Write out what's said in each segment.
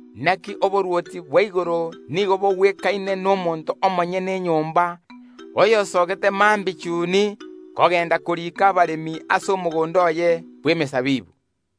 “Inaki oborwoti bwa igoro nigo bogwekaine n’omonto omonyene enyomba oyosoogete mambia chuni kogenda koriika abaremi ase omogondo oye bw’emesabibu.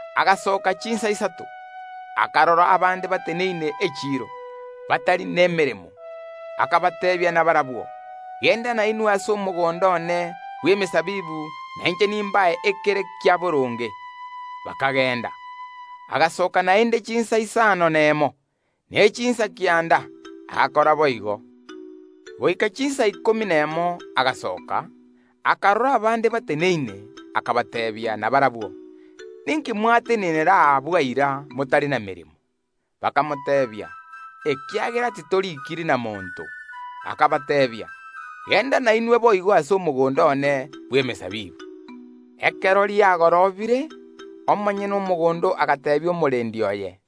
Agasoka chinsa isato, akarora abande bateneine echiiro, batari nemeremo, akabateebia nabarabwo: Genda nainwe ase omogondo one bw’emesabibu na inche nimbae ekebagwenerete. Bakagenda. Agasoka naende chinsa isano nemo, ne chinsa kianda, agakora boigo. Goika chinsa ikomi nemo agasoka, akarora abande bateneine, akababoria nabarabwo: Ninki mwatenenera aa bwaira, motari nameremo? Bakamoiraneria: Ekiagera monto onde tatoriigeti. Akabateebia: Genda nainwe boigo ase omogondo one bw’emesabibu. Ekero riagorobire, omonyene omogondo agateebia omoteneneri oye: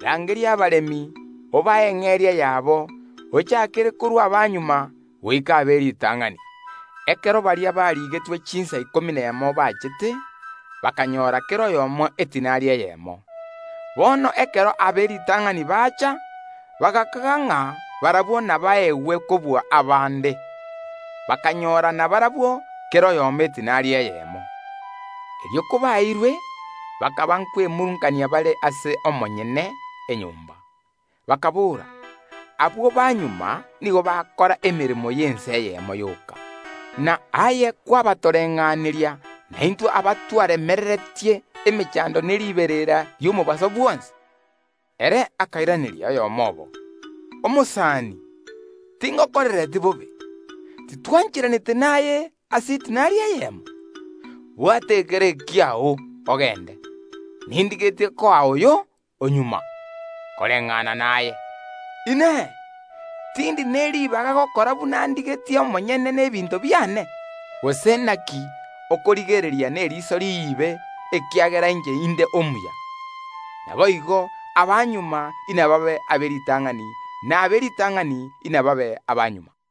Rangeria abaremi, obae eng’eria yabo, ochaakere korwa abamagega goika ab’eritang’ani. Ekero baria barigetwe chinsa ikomi nemo baachete, bakanyora kera oyomo edinari eyemo. Bono ekero ab’eritang’ani bacha, bagakaga ng’a barabwo nabaegwe kobua abande, bakanyora nabarabwo kera oyomo edinari eyemo. Erio kabaeirwe, bakaba nkwemurungania bare ase omonyene enyomba, bakaboora: Abwo ba magega nigo bakora emeremo y’ensa eyemo yoka, na aye kwabatoreng’aneria naintwe abatwaremereretie emechando ne riberera ri’omobaso bwonsi? Ere akairaneria oyomo obo: Omosani, tingokorereti bobe. Titwancheranete naye ase edinari eyemo? Bwata ekere ekiao, ogende; nindigetie koa oyo o magega koreng’ana naye. Inee! Tindi neribaga gokora buna ndigetie omonyene n’ebinto biane? Gose naki okorigereria neriso riibe, ekiagera inche inde omuya? Naboigo abamagega inababe ab’eritang’ani, na ab’eritang’ani inababe abamagega.”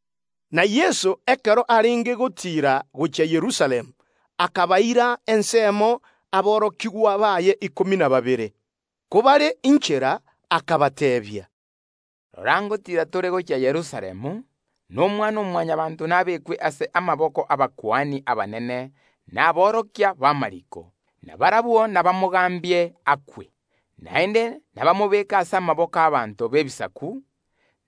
Nabo, ekero Yeso arenge gotiira gochia Yerusalemu, akabaira aborokigwa baye ikomi na babere ensemo. Kobare inchera, akabateebia, “Rora, ngotiira tore gochia Yerusalemu, na Omwana-o-Mwanyabaanto naruugwe ase amaboko y’abakuani abanene na aborokia b’amariiko, na barabwo ’nabamonachere ekiina ki’ogokwa, naende nabamorue ase amaboko y’ abanto b’Ebisaku;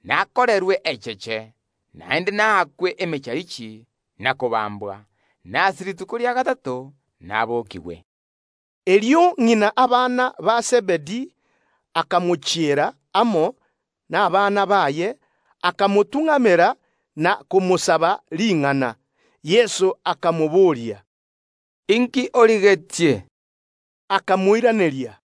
nakorerwe echeche, naende naakwe emecharichi na kobambwa; na ase rituko ria gatato nabokigwe.” Erio ng’ina abana ba Zebedi akamochiera Yeso amo nabana baye, akamotung’amera na komosaba ring’ana. Yeso akamobooria, “Inki origetie?” Akamoiraneria,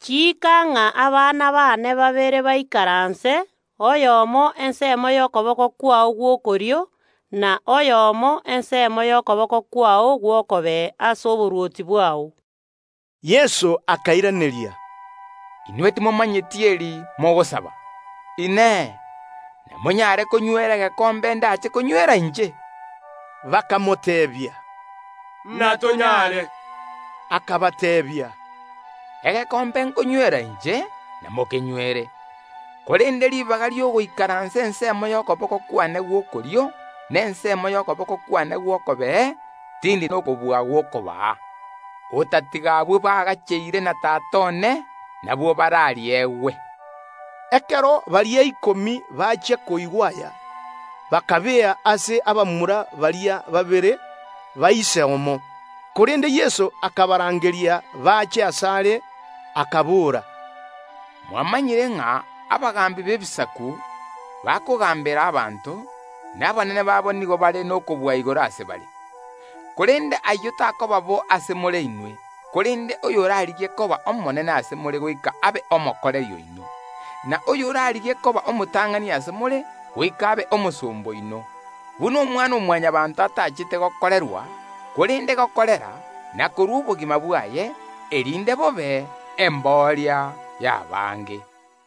“Chiika ng’a abana bane babere baikaranse, oyomo ensemo y’okoboko kwao gw’okorio, n’oyonde ensemo y’okoboko kwao gw’okobee ase oborwoti bwao.” Yeso akairaneria, “Inwe timomanyeti eri mogosaba. Inee! Namonyare konywera egekombe ’ndache konywera inche?” Bakamoteebia, “Natonyare.” Akabateebia, “Egekombe ’nkonywera inche, namokenywere, korende ribaga ri’ogoikaransa ensemo y’okoboko kwane gw’okorio ney’okobee, tindi nokobua gw’okobaa, otatiga abwo bagacheire na Tata one nabwo barariegwe.” Ekero baria ikomi bachia koigwa aya, bakababea abamura baria babere. Korende Yeso akabarangeria bache asare, akabora, “Mwamanyire ng’a abagaambi b’Ebisaku bakogaambera abanto, na abanene babo nigo bare n’okobua igoro ase bare. Korende ase more inwe, ayio takoba bo. Korende, oyorarigie koba omonene ase more, goika abe omokoreri oino; na oyorarigie koba omotang’ani ase more, goika abe omosomba oino, buna Omwana-o-Mwanyabaanto atachete gokorerwa, korende gokorera, na korua obogima bwaye, erinde bobe embooria y’abange.”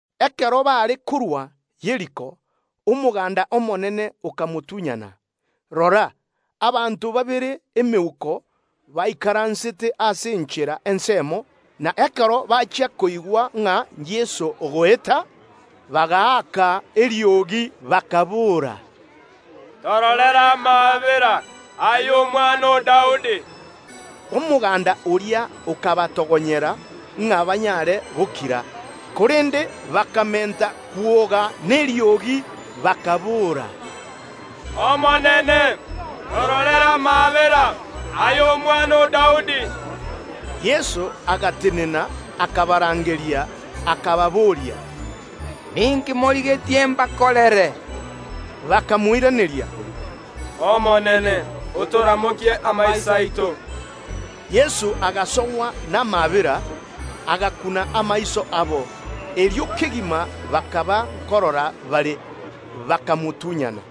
Ekero baare korua Yeriko, omoganda omonene okamotunyana. Rora, abanto babere emeuko baikaransete ase enchera ensemo, na ekero bachia koigwa Yeso ogoeta, bagaaka eriogi, bakaboora, “Omonene omwana o Daudi! Tororere amaabera.” Omoganda oria okabatogonyera ng’a banyare gokira, korende bakamenta kwoga mono, bakaboora, “Omonene, tororere amaabera, aye Omwana o Daudi.” Yeso agatenena, akabarangeria, akababoria, “Ninki morigetie mbakorere?” Bakamoiraneria, “Omonene, otoramokie amaiso aito.” Yeso agasogwa namaabera, agakuna amaiso abo. Erio kegima bakarora, bakamotunyana.